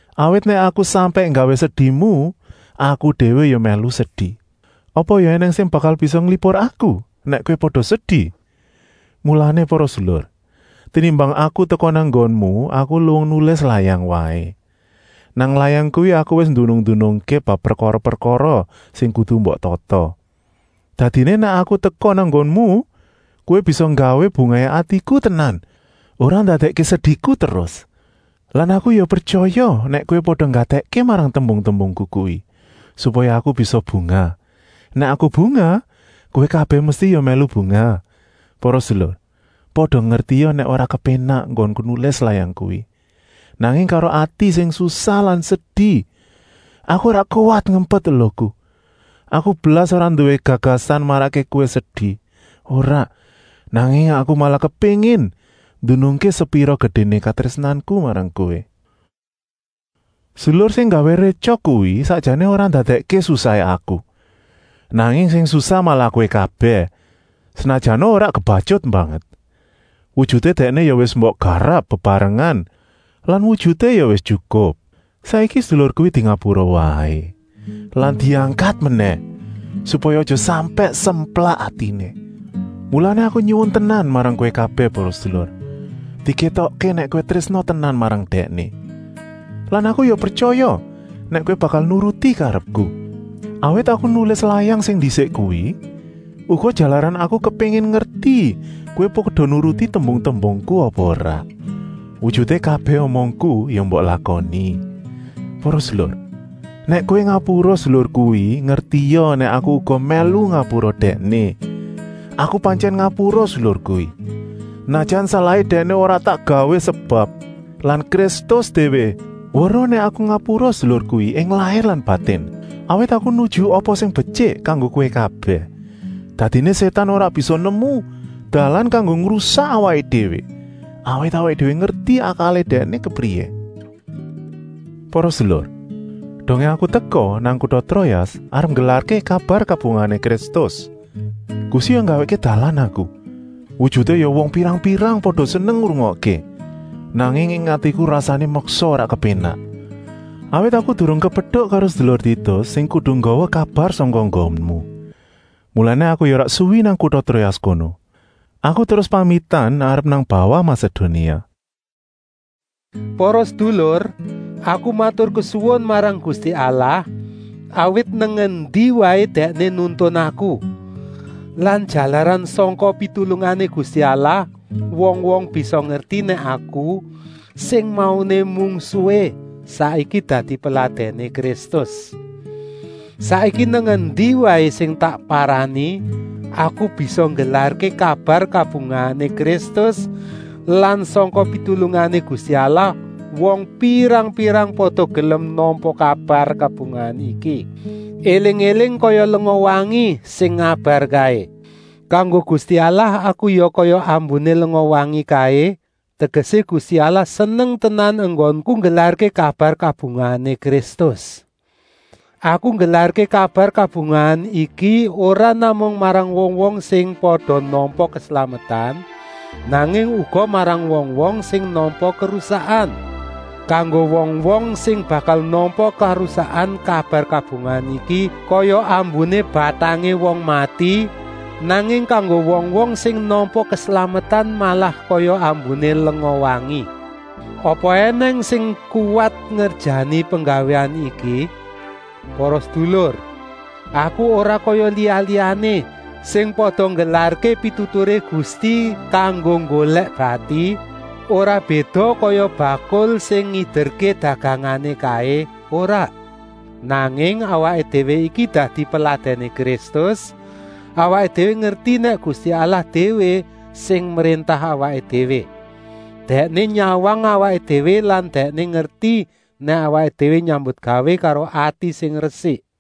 Awit nèk aku sampèk nggawé sedimu, aku déwé ya mèlu sedi. Apa ya ènèng sing bakal bisa nglipur aku nèk kowé pada sedi. Mulané para sedulur, tenimbang aku teka nang nggonmu, aku luwung nulis layang waé. Nang layang kuwi aku wis ndunung-ndunungké bab prekara-prekara sing kudu mbok tata. Dadiné nèk aku teka nang nggonmu, kowé bisa nggawé bungahé atiku tenan, ora ndadèkké sediku terus. Lan aku ya pretyaya nèk kowé pada nggatèkké marang tembung-tembungku kuwi, supaya aku bisa bungah. Nèk aku bungah, kowé kabèh mesti ya mèlu bungah. Para sedulur, pada ngertia nèk ora kepénak enggonku nulis layang kuwi, nanging karo ati sing susah lan sedi. Aku ora kuwat ngempet eluhku. Aku blas ora nduwé gagasan marakké kowé sedi, ora, nanging aku malah kepéngin ndunungké sepira gedéné katrésnanku marang kowé. Sedulur sing nggawé rétyok kuwi sakjané ora ndadèkké susahé aku, nanging sing susah malah kowé kabèh, senajana ora kebatyut banget. Wujuté dèkné ya wis mbok garap bebarengan lan wujuté ya wis tyukup. Saiki sedulur kuwi dingapura waé lan diangkat menèh, supaya aja sampèk semplak atiné. Mulané aku nyuwun tenan marang kowé kabèh para sedulur, dikétokké nèk kowé trésna tenan marang dèkné. Lan aku ya pretyaya nèk kowé bakal nuruti karepku, awit aku nulis layang sing ndisik kuwi, uga jalaran aku kepéngin ngerti kowé pada nuruti tembung-tembungku apa ora. Wujuté kabèh omongku ya mbok lakoni. Para sedulur, nèk kowé ngapura sedulur kuwi, ngertia nèk aku uga mèlu ngapura dèkné. Aku pantyèn ngapura sedulur kuwi, senajan salahé dèkné ya ora tak gawé sebab lan Kristus déwé weruh nèk aku ngapura sedulur kuwi ing lair lan batin, awit aku nuju apa sing betyik kanggo kowé kabèh. Dadiné Sétan ora bisa nemu dalan kanggo ngrusak awaké déwé, awit awaké déwé ngerti akalé dèkné kepriyé. Para sedulur, dongé aku teka nang kuta Troas arep nggelarké kabar kabungahané Kristus, Gusti ya nggawèkké dalan aku, wujuté ya wong pirang-pirang pada seneng ngrungokké. Nanging ing atiku rasané meksa ora kepénak, awit aku durung kepetuk karo sedulur Titus sing kudu nggawa kabar sangka nggonmu. Mulané aku ya ora suwi nang kuta Troas kono, aku terus pamitan arep nang bawah Masedonia. Para sedulur, aku maturkesuwun marang Gusti Allah, awit nang endi waé Dèkné nuntun aku. Lan jalaran sangka pitulungané Gusti Allah wong-wong bisa ngerti nèk aku, sing mauné mungsuhé, saiki dadi peladèné Kristus. Saiki nang endi waé sing tak parani, aku bisa nggelarké kabar kabungahané Kristus lan sangka pitulungané Gusti Allah wong pirang-pirang pada gelem nampa kabar kabungahan iki, éling-éling kaya lenga wangi sing ngabar kaé. Kanggo Gusti Allah aku ya kaya ambuné lenga wangi kaé, tegesé Gusti Allah seneng tenan enggonku nggelarké kabar kabungahané Kristus. Aku nggelarké kabar kabungahan iki ora namung marang wong-wong sing pada nampa keslametan, nanging uga marang wong-wong sing nampa karusakan. Kanggo wong-wong sing bakal nampa karusakan kabar kabungahan iki kaya ambuné batangé wong mati, nanging kanggo wong-wong sing nampa keslametan malah kaya ambuné lenga wengi. Apa ènèng sing kuwat ngerjani penggawéan iki? Para sedulur, aku ora kaya liya-liyané sing pada nggelarké pituturé Gusti kanggo nggolèk bati, ora béda kaya bakul sing ngiderké dagangané kaé, ora. Nanging awaké déwé iki dadi peladèné Kristus, awaké déwé ngerti nèk Gusti Allah déwé sing mréntah awaké déwé. Dèkné nyawang awaké déwé lan Dèkné ngerti nèk awaké déwé nyambutgawé karo ati sing resik.